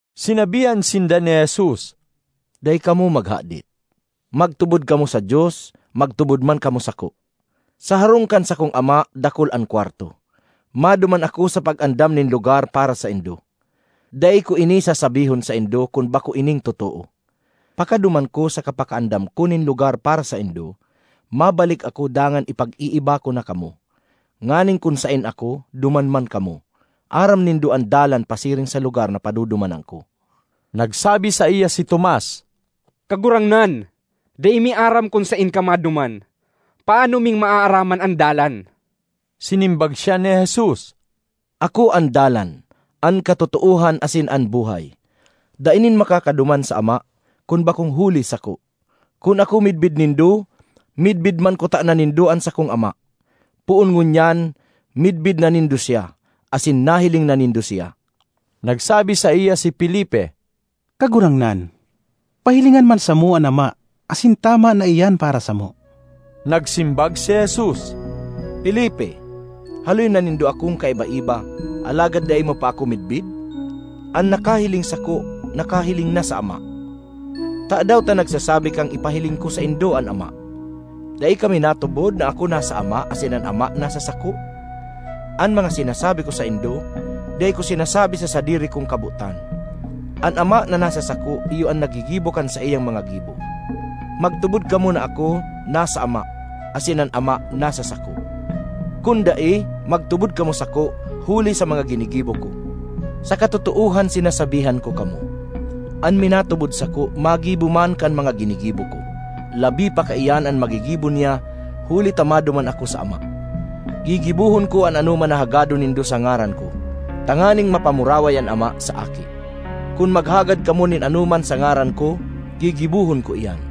Sinabihan sinda ni Jesus, “Dai kamo maghadit. Magtubod kamo sa Dios, magtubod man kamo sako. Sa harong kan sakong Ama dakul an kwarto; maduman ako sa pag-andam nin lugar para saindo. Dai ko ini sasabihon saindo, kun bako ining totoo. Pakaduman ko saka pakaandam ko nin lugar para saindo, mabalik ako dangan ipag-iiba ko na kamo, nganing kun saen ako, duman man kamo. Aram nindo an dalan pasiring sa lugar na padudumanan ko.” Nagsabi saiya si Tomas, “Kagurangnan, dai mi aram kun saen ka maduman; paano ming maaraman an dalan?” Sinimbag siya ni Jesus, “Ako an dalan, an katotoohan asin an buhay; dai nin makakaduman sa Ama, kun bakong huli sako. Kun ako midbid nindo, midbid man kutana nindo an sakong Ama; poon ngunyan midbid na nindo siya, asin nahiling na nindo siya.” Nagsabi saiya si Felipe, “Kagurangnan, pahilingan man samo an Ama asin tama na iyan para samo.” Nagsimbag si Jesus, “Felipe, haloy na nindo akong kaiba-iba, alagad dai mo pa ako midbid? An nakahiling sako, nakahiling na sa Ama. Tadaw ta nagsasabi kang ipahiling ko saindo an Ama? Dai ka minatubod na ako nasa Ama asin an Ama nasa sako? An mga sinasabi ko saindo, dai ko sinasabi sa sadiri kong kabotan. An Ama, na nasa sako iyo an naggigibo kan saiyang mga gibo. Magtubod kamo na ako, nasa Ama asin an Ama nasa sako. Kun dai, magtubod kamo sako huli sa mga ginigibo ko. Sa katotoohan sinasabihan ko kamo, an minatubod sako magibo man kan mga ginigibo ko—labi pa kaiyan an magigibo niya huli ta maduman ako sa Ama. Gigibohon ko an anoman na hagadon nindo sa ngaran ko, tanganing mapamuraway an Ama sa Aki. Kun maghagad kamo nin anoman sa ngaran ko, gigibohon ko iyan.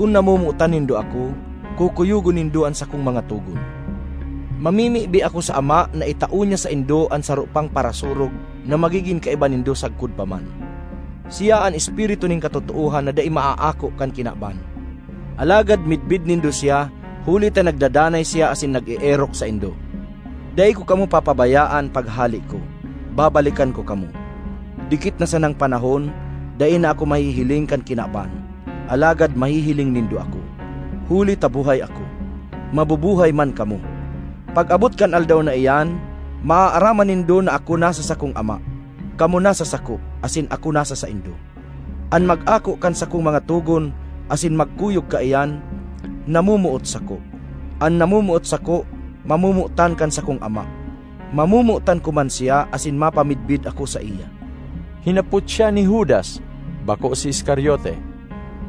”Kun namomotan nindo ako, kukuyogon nindo an sakong mga togon. Mamimibi ako sa Ama na itao niya saindo an saro pang Parasurog na magigin kaiba nindo sagkod pa man. Siya an Espiritu nin katotoohan na dai maaako kan kinaban. Alagad midbid nindo siya, huli ta nagdadanay siya asin nag-eerok saindo. ”Dai ko kamo papabayaan paghale ko; babalikan ko kamo. Dikit na sanang panahon, dai na ako mahihiling kan kinaban. Alagad mahihiling nindo ako; huli ta buhay ako, mabubuhay man kamo. Pag-abot kan aldaw na iyan, maaaraman nindo na ako nasa sakong Ama, kamo nasa sako, asin ako nasa saindo. ”An mag-ako kan sakong mga togon asin magkuyog kaiyan, namomoot sako. An namomoot sako mamomotan kan sakong Ama; mamomotan ko man siya asin mapamidbid ako saiya.” Hinapot siya ni Judas (bako si Iscariote),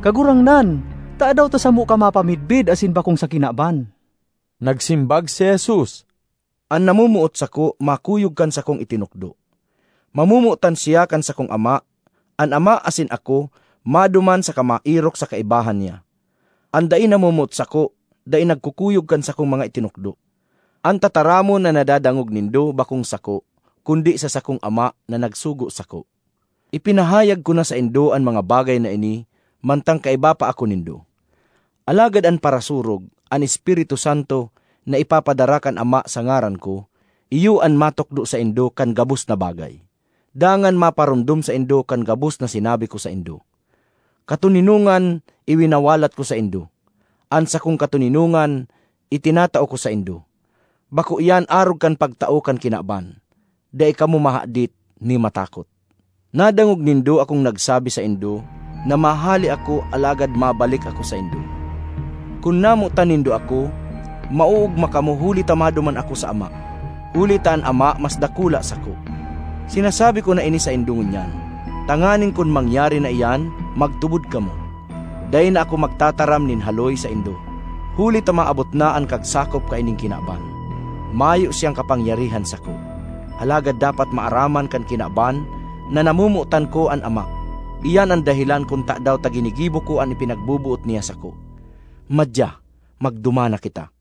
“Kagurangnan, tadaw ta samo ka mapamidbid asin bakong sa kinaban?” Nagsimbag si Jesus, “An namomoot sako, makuyog kan sakong itinukdo. Mamomotan siya kan sakong Ama; an Ama asin ako maduman saka maerok sa kaibahan niya. An dai namomoot sako, dai nagkukuyog kan sakong mga itinukdo. An tataramon na nadadangog nindo bakong sako; kundi sa sakong Ama na nagsugo sako. ”Ipinahayag ko na saindo an mga bagay na ini mantang kaiba pa ako nindo. Alagad an Parasurog, an Espiritu Santo na ipapadara kan Ama sa ngaran ko, iyo an matukdo saindo kan gabos na bagay, dangan maparomdom saindo kan gabos na sinabi ko saindo. ”Katoninongan iwinawalat ko saindo; an sakong katoninongan itinatao ko saindo. Bako iyan arog kan pagtao kan kinaban. Dai kamo mahadit ni matakot. Nadangog nindo akong nagsabi saindo na mahale ako alagad mabalik ako saindo. Kun namotan nindo ako, maoogma kamo huli ta maduman ako sa Ama; huli ta an Ama mas dakula sako. Sinasabi ko na ini saindo ngunyan, tanganing kun mangyari na iyan, magtubod kamo. Dai na ako magtataram nin haloy saindo, huli ta maabot na an kagsakop kaining kinaban. Mayo siyang kapangyarihan sako, alagad dapat maaraman kan kinaban na namomotan ko an Ama; iyan an dahelan kun tadaw ta ginigibo ko an ipinagboboot niya sako. “Madya, magduman na kita!”